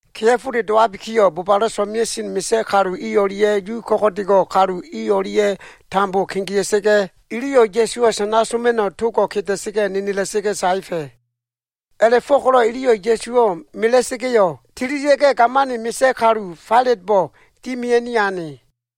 Kea꞉fole dowabikiyo꞉, bobalo꞉ so꞉mea꞉sen misa꞉ kalu i o꞉lia꞉ Yu ko꞉go꞉dego꞉ kalu i o꞉lia꞉ tambo kegea꞉sa꞉ga꞉, iliyo꞉ Ya꞉suwo꞉ sana soma꞉no꞉ togo꞉ nenela꞉sa꞉ga꞉ saefa꞉. A꞉la꞉fo꞉ko꞉lo꞉ iliyo꞉ Ya꞉suwo꞉ mela꞉sa꞉ga꞉yo꞉, tililia꞉ga꞉, gamani misa꞉ kalu Failatbo꞉ dimia꞉ni ane.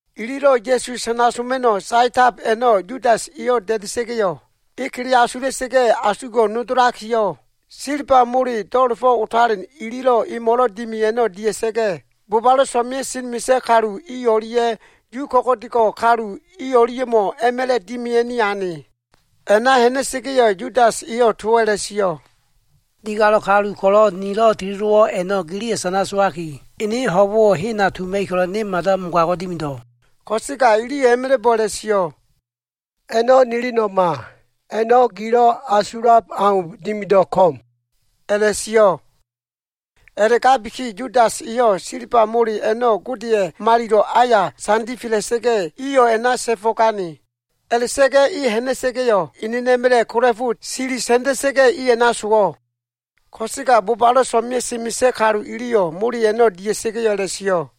Ililo꞉ Ya꞉su sana soma꞉no꞉ saetab a꞉no꞉ Yudas eyo꞉ da꞉da꞉sa꞉ga꞉yo꞉, e kele asula꞉sa꞉ga꞉ asugo꞉ nodolakiyo꞉, silba mole do꞉la꞉fo꞉ otalen ililo꞉ emo꞉lo꞉ dimi a꞉no꞉ dia꞉sa꞉ga꞉, bobalo꞉ so꞉mea꞉sen misa꞉ kalu o꞉lia꞉ Yu ko꞉go꞉dego꞉ kalu i o꞉lia꞉mo꞉ a꞉ma꞉la꞉ dimia꞉ni ane. A꞉na ha꞉na꞉sa꞉ga꞉yo꞉, Yudas eyo꞉ towo꞉ a꞉la꞉sio꞉, “Digalo꞉ kalu ko꞉lo꞉ nilo꞉ teledowo꞉ a꞉no꞉ giliyo꞉ sana sowaki, ene ho꞉bo꞉wo꞉ hena tuma꞉ib ko꞉lo꞉ ne mada mogago꞉ dimido꞉.” Ko꞉sega iliyo꞉ a꞉ma꞉la꞉bo꞉ a꞉la꞉sio꞉, “A꞉no꞉ nilino꞉ma. A꞉no꞉ gilo꞉ asulab au dimido꞉ ko꞉m,” a꞉la꞉sio꞉. A꞉la꞉gabiki Yudas eyo꞉ silba mole a꞉no꞉ Godeya꞉ malilo꞉ aya sandifela꞉sa꞉ga꞉, iyo꞉ a꞉na ta꞉fo꞉gane. A꞉la꞉ta꞉ga꞉ e ha꞉na꞉sa꞉ga꞉yo꞉, enena꞉ma꞉la꞉ kola꞉fo silisa꞉nda꞉sa꞉ga꞉, a꞉na sowo꞉. Ko꞉sega bobalo꞉ so꞉mea꞉sen misa꞉ kalu iliyo꞉ mole a꞉no꞉ dia꞉sa꞉ga꞉yo꞉ a꞉la꞉sio꞉,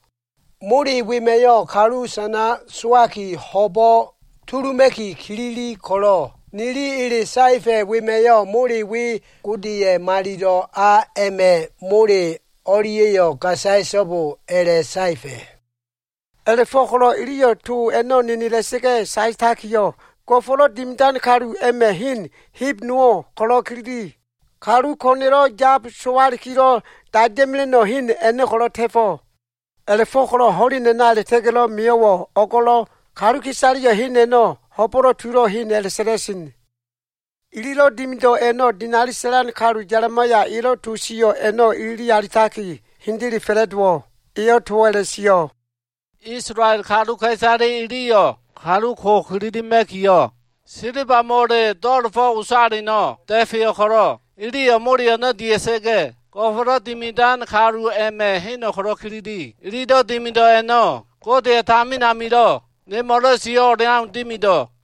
“Mole wema꞉yo꞉, kalu sana sowaki ho꞉bo꞉ tuluma꞉ki kilili ko꞉lo꞉, nili ele saefa꞉ a꞉ma꞉yo꞉ mole we, Godeya꞉ malilo꞉ a a꞉ma꞉ mole o꞉lia꞉yo꞉ gasaya꞉so꞉bo a꞉la꞉saefa꞉.” A꞉la꞉fo꞉ko꞉lo꞉ iliyo꞉ towo꞉ nenela꞉sa꞉ga꞉ saetakiyo꞉, Go꞉fo꞉lo꞉ Dimidan kalu a꞉ma꞉ hen heb nowo꞉ ko꞉lo꞉ kilili. Kalu ko꞉na꞉lo꞉ yab sowalikilo꞉ daida꞉mela꞉no꞉ hen a꞉no꞉ ko꞉lo꞉ ta꞉fo꞉. A꞉la꞉fo꞉ko꞉lo꞉ ho꞉len a꞉na a꞉la꞉ta꞉ga꞉lo꞉ mio꞉wo꞉, o꞉go꞉lo꞉, kaluka꞉isaleya꞉yo꞉ hen a꞉no꞉ Ho꞉bo꞉lo꞉ Tulo꞉ Hen a꞉la꞉sa꞉la꞉sen. Ililo꞉ dimido꞉ a꞉no꞉, dinali sa꞉lan kalu Ya꞉limaya elo꞉ to sio꞉ a꞉no꞉ ilili alitaki hendele fa꞉la꞉dowo꞉. Eyo꞉ towo꞉ a꞉la꞉sio꞉, “Isolael kaluka꞉isale iliyo꞉ kalu ko ko꞉lo꞉ kililima꞉kiyo꞉ silba mole do꞉la꞉fo꞉ otaleno꞉ da꞉feyo꞉ ko꞉lo꞉, iliyo꞉ mole a꞉no꞉ dia꞉sa꞉ga꞉, Go꞉fo꞉lo꞉ Dimidan kaluwa꞉ hen a꞉no꞉ ko꞉lo꞉ kilili. Ililo꞉ dimido꞉ a꞉no꞉ Godeya꞉ tamin amilo꞉ nemo꞉lo꞉ sio꞉ o꞉leau dimido꞉.”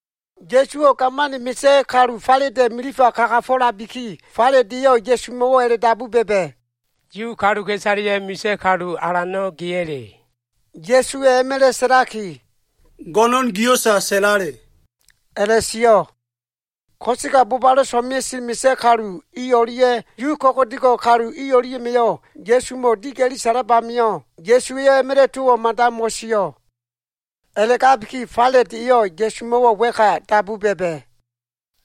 Ya꞉suwo꞉ gamani misa꞉ kalu Failata꞉ milifa kagafo꞉labiki, Failat eyo꞉ Ya꞉sumo꞉wo꞉ dabu ba꞉ba꞉, “Yu kaluka꞉isaleya꞉ misa꞉ kalu alano꞉ geya꞉le?” Ya꞉suwa꞉ a꞉ma꞉la꞉ sa꞉laki, “Go꞉no꞉n gio꞉sa sa꞉lale,” a꞉la꞉sio꞉. Ko꞉sega bobalo꞉ so꞉mea꞉sen misa꞉ kalu i o꞉lia꞉ Yuwa꞉ ko꞉go꞉do꞉ kalu i o꞉lia꞉ma꞉yo꞉ Ya꞉sumo꞉ diga꞉li sa꞉lab amio꞉, Ya꞉suwa꞉yo꞉ a꞉ma꞉la꞉ towo꞉ mada mo꞉sio꞉. A꞉la꞉gabiki Failat eyo꞉ Ya꞉sumo꞉wo꞉ wa꞉ka dabu ba꞉ba꞉,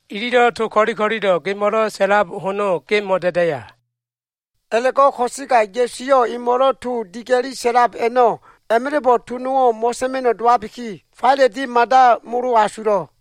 “Ililo꞉ to ko꞉li ko꞉lilo꞉ gemo꞉lo꞉ sa꞉lab hono ge mo꞉da꞉daya?” A꞉la꞉go꞉ ko꞉sega Ya꞉su eyo꞉ emo꞉lo꞉ to diga꞉li sa꞉lab a꞉no꞉ a꞉ma꞉la꞉bo꞉ to nowo꞉ mo꞉sa꞉ma꞉no꞉ dowabiki, Failat e mada molo asulo꞉.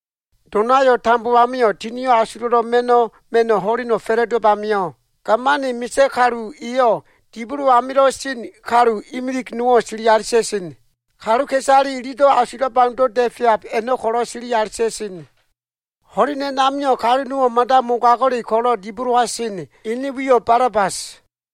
Donayo꞉ tambo amio꞉, Tinio꞉ Asulo꞉lo꞉ Ma꞉no꞉ ma꞉no꞉ ho꞉leno꞉ fa꞉la꞉dowab amio꞉, gamani misa꞉ kalu eyo꞉ dibolo amilo꞉ sen kalu imilig nowo꞉ sili alita꞉sen. Kaluka꞉isale ililo꞉ asulab aundo꞉ da꞉feab a꞉no꞉ ko꞉lo꞉ sili alita꞉sen. O꞉g ho꞉len a꞉namio꞉, kalu nowo꞉ mada mogago꞉le ko꞉lo꞉ dibolowa sen, ene wiyo꞉ Balabas.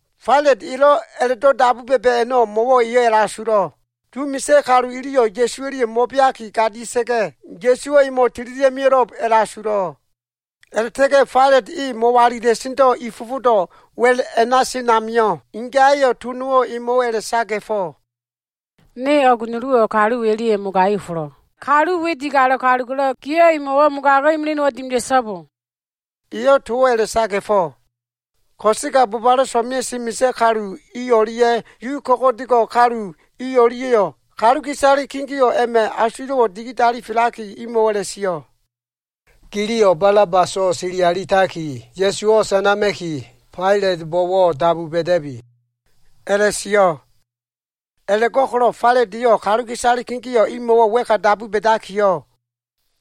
Failat elo꞉ a꞉la꞉do꞉ dabu ba꞉ba꞉ a꞉no꞉, mo꞉wo꞉ eyo꞉ a꞉la꞉asulo꞉. Yu misa꞉ kalu iliyo꞉ Ya꞉su o꞉lia꞉yo꞉ mo꞉beaki gadia꞉sa꞉ga꞉, Ya꞉suwo꞉ emo꞉ tililia꞉ mio꞉lo꞉b a꞉la꞉asulo꞉. A꞉la꞉ta꞉ga꞉ Failat e mo꞉walila꞉sendo꞉ i fofodo꞉ wa꞉l a꞉na sen amio꞉, ingaya꞉yo꞉ to nowo꞉ emo꞉wo꞉ a꞉la꞉saga꞉fo꞉, “O꞉g nuluwo꞉ niyo꞉ kalu we o꞉lia꞉ mogai ofolo꞉. Kalu we digalo꞉ kalu ko꞉lo꞉, giyo꞉ emo꞉wo꞉ mogago꞉ imili nowo꞉ dimida꞉so꞉bo.” Eyo꞉ towo꞉ a꞉la꞉saga꞉fo꞉. Ko꞉sega bobalo꞉ so꞉mea꞉sen misa꞉ kalu i o꞉lia꞉ Yu ko꞉go꞉dego꞉ kalu iliyo꞉ kaluka꞉isale kegeo꞉ a꞉ma꞉ asulo꞉wo꞉ digidalifelakiyo꞉, imo꞉wo꞉ a꞉la꞉sio꞉, “Giliyo꞉ Balabaso꞉ sili alitaki, Ya꞉suwo꞉ sanama꞉ki Failatbo꞉wo꞉ dabu ba꞉da꞉bi,” a꞉la꞉sio꞉. A꞉la꞉go꞉ko꞉lo꞉ Failat eyo꞉ kaluka꞉isale kegeo꞉ imo꞉wo꞉ wa꞉ka dabu ba꞉dakiyo꞉,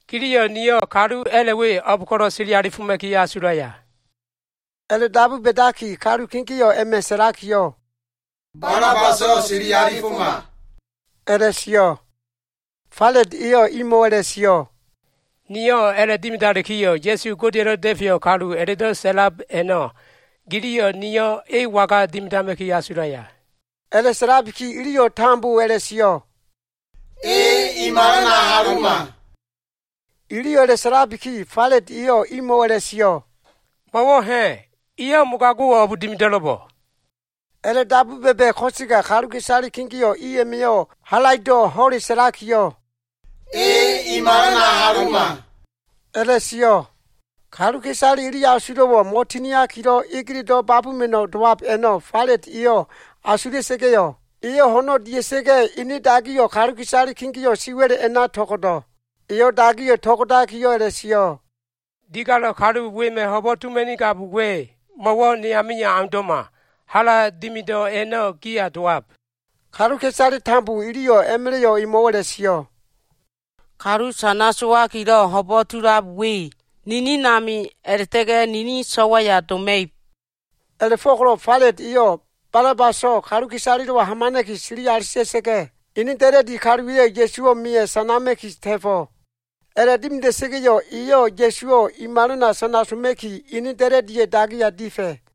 “Giliyo꞉ niyo꞉ kalu a꞉la꞉ we o꞉b ko꞉lo꞉ sili alifoma꞉ki asulaya?” A꞉la꞉dabu ba꞉dabiki, kalu kegeo꞉ a꞉ma꞉ sa꞉lakiyo꞉, “Balabaso꞉ sili alifoma” a꞉la꞉sio꞉. Failat eyo꞉ imo꞉wo꞉ a꞉la꞉sio꞉, “Niyo꞉ a꞉la꞉dimidalikiyo꞉, Ya꞉su Godeya꞉lo꞉ Da꞉feyo꞉ kalu a꞉la꞉do꞉ sa꞉lab a꞉no꞉, giliyo꞉ niyo꞉ e waga dimidama꞉ki asulaya?” A꞉la꞉sa꞉labiki, iliyo꞉ tambo a꞉la꞉sio꞉, “E i malana aluma.” Iliyo꞉ a꞉la꞉sa꞉labiki, Failat eyo꞉ imo꞉wo꞉ a꞉la꞉sio꞉, “Mo꞉wo꞉ ha꞉? Eyo꞉ mogago꞉wo꞉ o꞉b dimido꞉lo꞉bo꞉?” A꞉la꞉dabu ba꞉ba꞉ ko꞉sega kaluka꞉isale kegeo꞉ i a꞉ma꞉yo꞉ halaido꞉ ho꞉le sa꞉lakiyo꞉, “E i malana aluma” a꞉la꞉sio꞉. Kaluka꞉isale ili asulo꞉wo꞉ mo꞉tinakilo꞉ egeledo꞉ babuma꞉no꞉ dowab a꞉no꞉ Failat eyo꞉ asula꞉sa꞉ga꞉yo꞉, eyo꞉ ho꞉no꞉ dia꞉sa꞉ga꞉, ene dagiyo꞉ kaluka꞉isale kegeo꞉ siwa꞉l a꞉na to꞉go꞉do꞉. Eyo꞉ dagiyo꞉ to꞉go꞉dakiyo꞉ a꞉la꞉sio꞉, “Digalo꞉ kalu wema꞉ ho꞉bo꞉ tuma꞉nigab we, mo꞉wo꞉ ne amio꞉ aundo꞉ma. Hala dimido꞉ a꞉no꞉ giya dowab.” Kaluka꞉isale tambo iliyo꞉ a꞉ma꞉la꞉yo꞉ emo꞉wo꞉ a꞉la꞉sio꞉, “Kalu sana sowakilo꞉ ho꞉bo꞉ tulab we ninin ami a꞉la꞉ta꞉ga꞉ nini so꞉waya doma꞉ib.” A꞉la꞉fo꞉ko꞉lo꞉ Failat eyo꞉ Balabaso꞉ kaluka꞉isalelo꞉wa hamana꞉ki sili alita꞉sa꞉ga꞉, ene da꞉la꞉di kaluwa꞉yo꞉ Ya꞉suwo꞉ meya꞉ sanama꞉ki ta꞉fo꞉. A꞉la꞉dimida꞉sa꞉ga꞉yo꞉, eyo꞉ Ya꞉suwo꞉ i malana sana soma꞉ki, ene da꞉la꞉di kaluwa꞉ dagiya difa꞉.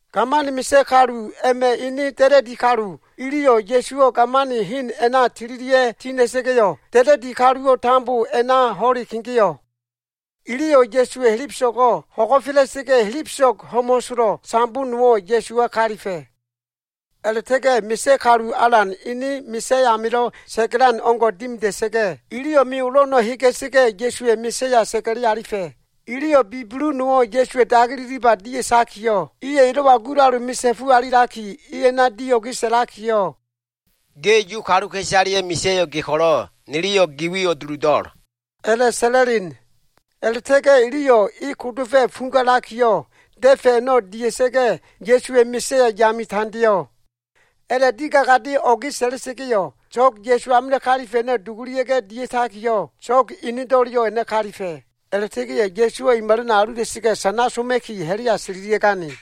Gamani misa꞉ kalu a꞉ma꞉ ene da꞉la꞉di kalu iliyo꞉ Ya꞉suwo꞉ gamani hen a꞉na tililia꞉ tina꞉sa꞉ga꞉yo꞉, da꞉la꞉di kaluwo꞉ tambo a꞉na ho꞉le kegeo꞉. Iliyo꞉ Ya꞉suwa꞉ helebeso꞉go꞉ hagola꞉sa꞉ga꞉, helebeso꞉g ho꞉mo꞉solo꞉ sambo nowo꞉ Ya꞉suwa kalifa꞉. A꞉la꞉ta꞉ga꞉ misa꞉ kalu alan ene misa꞉ amilo꞉ sa꞉ga꞉lan o꞉ngo꞉ dimida꞉sa꞉ga꞉, iliyo꞉ me olo꞉ a꞉no꞉ hega꞉sa꞉ga꞉, Ya꞉suwa꞉ misa꞉ya sa꞉ga꞉li alifa꞉. Iliyo꞉ bibulu nowo꞉ Ya꞉suwa꞉ dagi ililiba dia꞉takiyo꞉, iyo꞉ elo꞉wa gulalu misa꞉fu alilaki, e a꞉na dio꞉ge sa꞉lakiyo꞉, “Ge Yu kaluka꞉isaleya꞉ misa꞉yo꞉ ge ko꞉lo꞉, niliyo꞉ gi wiyo꞉ duludo꞉l,” a꞉la꞉sa꞉la꞉len. A꞉la꞉ta꞉ga꞉ iliyo꞉ e kodofa꞉ fugalakiyo꞉, da꞉fa꞉ a꞉no꞉ dia꞉ga꞉, Ya꞉suwa꞉ misa꞉ya yame tandeo꞉. A꞉la꞉ digagade o꞉ga꞉ sa꞉la꞉sa꞉ga꞉yo꞉, so꞉g Ya꞉su amilo꞉ kalifa꞉ a꞉no꞉ dugulia꞉ga꞉ dia꞉takiyo꞉, so꞉g enedo꞉leyo꞉ a꞉na kalifa꞉. A꞉la꞉ta꞉ga꞉yo꞉ Ya꞉suwo꞉ i malana alula꞉sa꞉ga꞉ sana soma꞉ki ha꞉la꞉ya tililia꞉gane.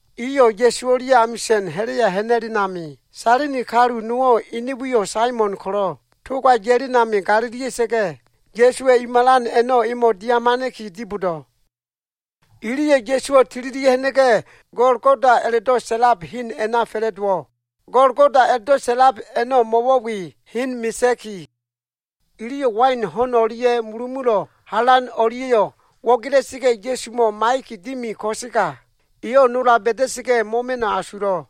Iyo꞉ Ya꞉su o꞉lia꞉ amisa꞉n ha꞉la꞉ya ha꞉na꞉len ami, Sailini kalu nowo꞉ ene wiyo꞉ Saimon ko꞉lo꞉, toga ya꞉len ami galilia꞉sa꞉ga꞉, Ya꞉suwa꞉ i malan a꞉no꞉ emo꞉ dia꞉hamana꞉ki dibodo꞉. Iliyo꞉ Ya꞉suwo꞉ tililia꞉ ha꞉na꞉ga꞉, Golgoda a꞉la꞉do꞉ sa꞉lab hen a꞉na fa꞉la꞉dowo꞉. Golgoda a꞉la꞉do꞉ sa꞉lab mo꞉wo꞉ we, hen misa꞉ki. Iliyo꞉ wain ho꞉n o꞉lia꞉ mulumulo꞉ halan o꞉lia꞉yo꞉ wo꞉gela꞉sa꞉ga꞉, Ya꞉sumo꞉ maiya꞉ki dimi, ko꞉sega eyo꞉ nola ba꞉da꞉sa꞉ga꞉ mo꞉ma꞉no꞉ asulo꞉.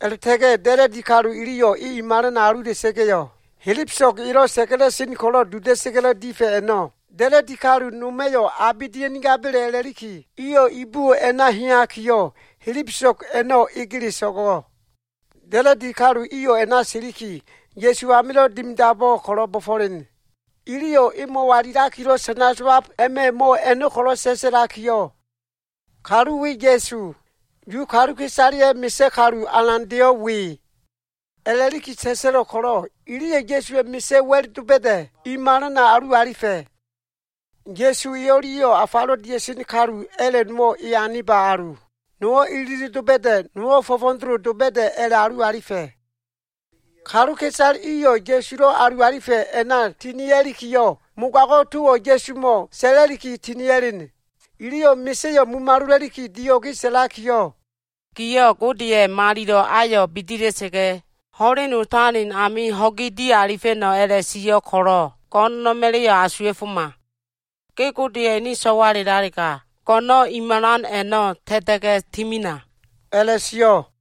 A꞉la꞉ta꞉ga꞉ da꞉la꞉di kalu iliyo꞉ e i malana alula꞉sa꞉ga꞉yo꞉, helebeso꞉g elo꞉ sa꞉ga꞉la꞉sen ko꞉lo꞉ duda꞉sa꞉ga꞉lo꞉ difa꞉ a꞉no꞉, da꞉la꞉di kalu noma꞉yo꞉ abe dia꞉nigaba꞉le a꞉la꞉liki, iyo꞉ ibuwo꞉ a꞉na heyakiyo꞉, helebeso꞉g a꞉no꞉ egele so꞉go꞉. Da꞉la꞉di kalu iyo꞉ a꞉na siliki, Ya꞉su a꞉namilo꞉ dimidabo꞉ ko꞉lo꞉ bo꞉fo꞉len. Iliyo꞉ e mo꞉walilakilo꞉ sana sowab a꞉ma꞉ mo꞉ a꞉no꞉ ko꞉lo꞉ sa꞉sa꞉lakiyo꞉, Kalu we Ya꞉su. Yu kaluka꞉isaleya꞉ Misa꞉ Kalu Alandeyo꞉ we a꞉la꞉liki sa꞉sa꞉lo꞉ ko꞉lo꞉, iliyo꞉ Ya꞉suwa꞉ misa꞉ wa꞉l doba꞉da꞉ i malana alu alifa꞉. Ya꞉su e o꞉lia꞉yo꞉ afalo꞉ dia꞉sen kalu a꞉la꞉ nowo꞉ e aniba alu. Nowo꞉ ililib doba꞉da꞉, nowo꞉ fo꞉fo꞉doloba꞉da꞉, a꞉la꞉alu alifa꞉. Kaluka꞉isale iyo꞉ Ya꞉sulo꞉ alu alifa꞉ a꞉na tinia꞉likiyo꞉, mogago꞉ towo꞉ Ya꞉sumo꞉ sa꞉la꞉liki tinia꞉len. Iliyo꞉ misa꞉yo꞉ mumalola꞉liki, dio꞉ge sa꞉lakiyo꞉, “Giyo꞉ Godeya꞉ malilo꞉ ayo꞉ bidila꞉sa꞉ga꞉, ho꞉len otalen amio꞉ ho꞉gi dialifa꞉no꞉ a꞉la꞉sio꞉ ko꞉lo꞉, go꞉no꞉na꞉ma꞉la꞉yo꞉ asuwa꞉foma. Ge Godeya꞉ ene so꞉walelalega, go꞉no꞉no꞉ i malan a꞉no꞉ ta꞉ta꞉ga꞉ timina,” a꞉la꞉sio꞉.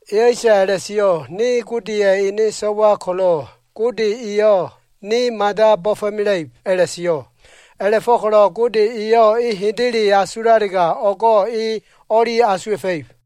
Eyo꞉sa a꞉la꞉sio꞉, ‘Ne Godeya꞉ ene so꞉wa ko꞉lo꞉, Gode eyo꞉ ne mada bo꞉fo꞉mela꞉ib,’ a꞉la꞉sio꞉. A꞉la꞉fo꞉ko꞉lo꞉ Gode eyo꞉ e hendele asulalega, o꞉go꞉ e o꞉li asuwa꞉fa꞉ib.”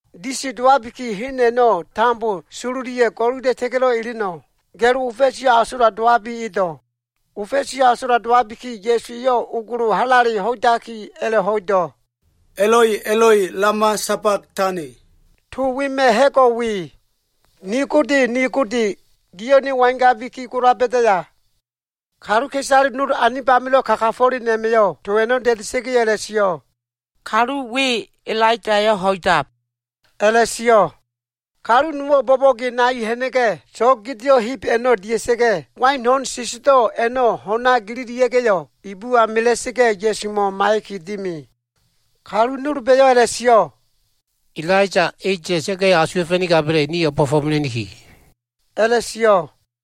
Disi dowabiki, hen a꞉no꞉ tambo sololiya꞉ go꞉lula꞉ta꞉ga꞉lo꞉ eleno꞉, ga꞉lo ofa꞉siyo꞉ asola dowabi edo꞉. Ofa꞉siyo꞉ asola dowabiki, Ya꞉su eyo꞉ ogolo halale ho꞉idaki, a꞉la꞉ho꞉ido꞉, “Eloi, Eloi, lama sabag tani.” To wema꞉ ha꞉go꞉ we, “Ni Gode, ni Gode, giyo꞉ ne wangabiki gola ba꞉daya?” Kaluka꞉isale nol anib amilo꞉ kagafo꞉len a꞉ma꞉yo꞉ to a꞉no꞉ da꞉da꞉sa꞉ga꞉yo꞉ a꞉la꞉sio꞉, “Kalu we Elaiyayo꞉ ho꞉idab,” a꞉la꞉sio꞉. Kalu nowo꞉ bo꞉bo꞉ge nai ha꞉na꞉ga꞉, so꞉g gedeo꞉ heb a꞉no꞉ dia꞉sa꞉ga꞉, wain ho꞉n sesedo꞉ a꞉no꞉ ho꞉na gelelia꞉ga꞉yo꞉, ibuwa mela꞉sa꞉ga꞉ Ya꞉sumo꞉ maiya꞉ki dimi. Kalu nolba꞉yo꞉ a꞉la꞉sio꞉, “Elaiya e ya꞉ga꞉yo꞉ asuwa꞉fa꞉nigaba꞉le, nio꞉ o꞉bo꞉fo꞉mela꞉niki,” a꞉la꞉sio꞉.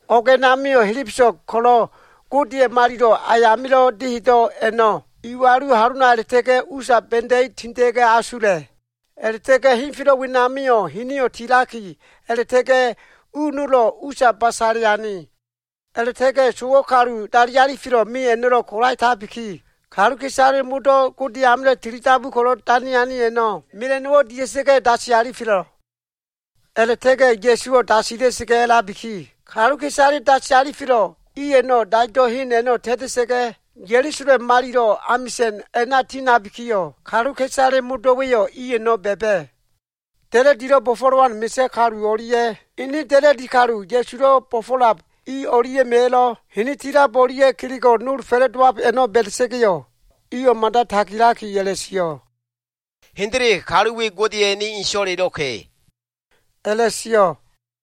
O꞉g a꞉namio꞉ helebeso꞉g ko꞉lo꞉ Godeya꞉ malilo꞉ ayamilo꞉ dehedo꞉ a꞉no꞉ iwalu halona a꞉la꞉ta꞉ga꞉ usa ba꞉da꞉i tinda꞉ga꞉ asula꞉. A꞉la꞉ta꞉ga꞉ henfelo꞉ wenamio꞉ hinio꞉ tilaki a꞉la꞉ta꞉ga꞉ u nolo꞉ usa basale ane. A꞉la꞉ta꞉ga꞉ sowo꞉ kalu dali alifelo꞉ me a꞉no꞉lo꞉ kolaetabiki, kaluka꞉isale modo꞉ Gode amilo꞉ tili dabu ko꞉lo꞉ dane ane a꞉no꞉ mela꞉no꞉wo꞉ dia꞉sa꞉ga꞉ dasi alifelo꞉. A꞉la꞉ta꞉ga꞉ Ya꞉suwo꞉ dasila꞉sa꞉ga꞉ a꞉labiki, kaluka꞉isale dasi alifelo꞉ i a꞉no꞉ daido꞉ hen a꞉no꞉ ta꞉ta꞉sa꞉ga꞉ Ya꞉lusalem malilo꞉ amisa꞉n a꞉na tiha꞉nabikiyo꞉, kaluka꞉isale modo꞉wa꞉yo꞉ i a꞉no꞉ ba꞉ba꞉. Da꞉la꞉dilo꞉ bo꞉fo꞉lowan misa꞉ kalu o꞉lia꞉ ene da꞉la꞉di kalu Ya꞉sulo꞉ bo꞉fo꞉lab i o꞉lia꞉ma꞉yo꞉ hini tilab o꞉lia꞉ kelego꞉ nol fa꞉la꞉dowab a꞉no꞉ ba꞉da꞉sa꞉ga꞉yo꞉, iyo꞉ mada tagilaki a꞉la꞉sio꞉, “Hendele, kalu we Godeya꞉ ene kalu so꞉walelo꞉ka꞉,” a꞉la꞉sio꞉.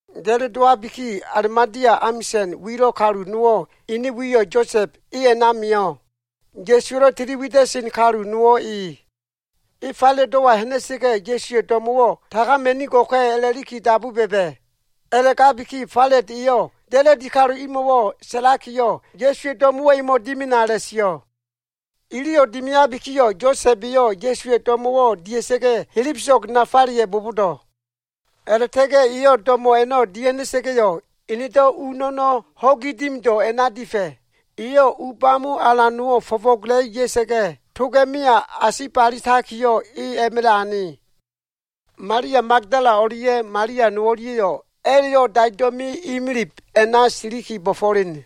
Ga꞉lo dowabiki, Alimatea amisa꞉n wilo꞉ kalu nowo꞉ ene wiyo꞉ Yosa꞉b e a꞉na mio꞉. Ya꞉suwa꞉lo꞉ tili wida꞉sen kalu nowo꞉ e. E Failatdo꞉wa ha꞉na꞉sa꞉ga꞉, Ya꞉suwa꞉ do꞉mo꞉wo꞉ tagama꞉nigo꞉ka꞉ a꞉la꞉liki dabu ba꞉ba꞉. A꞉la꞉gabiki Failat eyo꞉ da꞉la꞉di kalu imo꞉ sa꞉lakiyo꞉, Ya꞉suwa꞉ do꞉mo꞉wo꞉ emo꞉ dimina a꞉la꞉sio꞉. Iliyo꞉ dimiabikiyo꞉, Yosa꞉b eyo꞉ Ya꞉suwa꞉ do꞉mo꞉wo꞉ dia꞉sa꞉ga꞉yo꞉ helebeso꞉g nafaleya꞉ bobodo꞉. A꞉la꞉ta꞉ga꞉ eyo꞉ do꞉mo꞉ a꞉no꞉ dia꞉ha꞉na꞉sa꞉ga꞉yo꞉, enedo꞉ u no꞉no꞉ ho꞉gi dimido꞉ a꞉na difa꞉. Eyo꞉ u bamo alan nowo꞉ fo꞉fo꞉gola꞉i ya꞉sa꞉ga꞉, toga꞉meya asibalitakiyo꞉, e a꞉ma꞉la꞉ ane. Malia Magdala o꞉lia꞉ Malia no o꞉lia꞉yo꞉, a꞉la꞉yo꞉ daido꞉ me imilib a꞉na siliki bo꞉fo꞉len.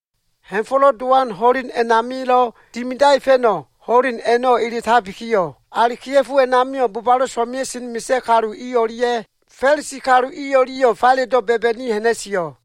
Ha꞉fo꞉lo꞉ Dowan ho꞉len a꞉namilo꞉ dimidaefa꞉no꞉ ho꞉len a꞉no꞉ eletabikiyo꞉, ali kea꞉fo a꞉namio꞉ bobalo꞉ so꞉mea꞉sen misa꞉ kalu i o꞉lia꞉ Fa꞉lisi kalu i o꞉lia꞉yo꞉ Failatdo꞉ ba꞉ba꞉ni ha꞉na꞉sio꞉.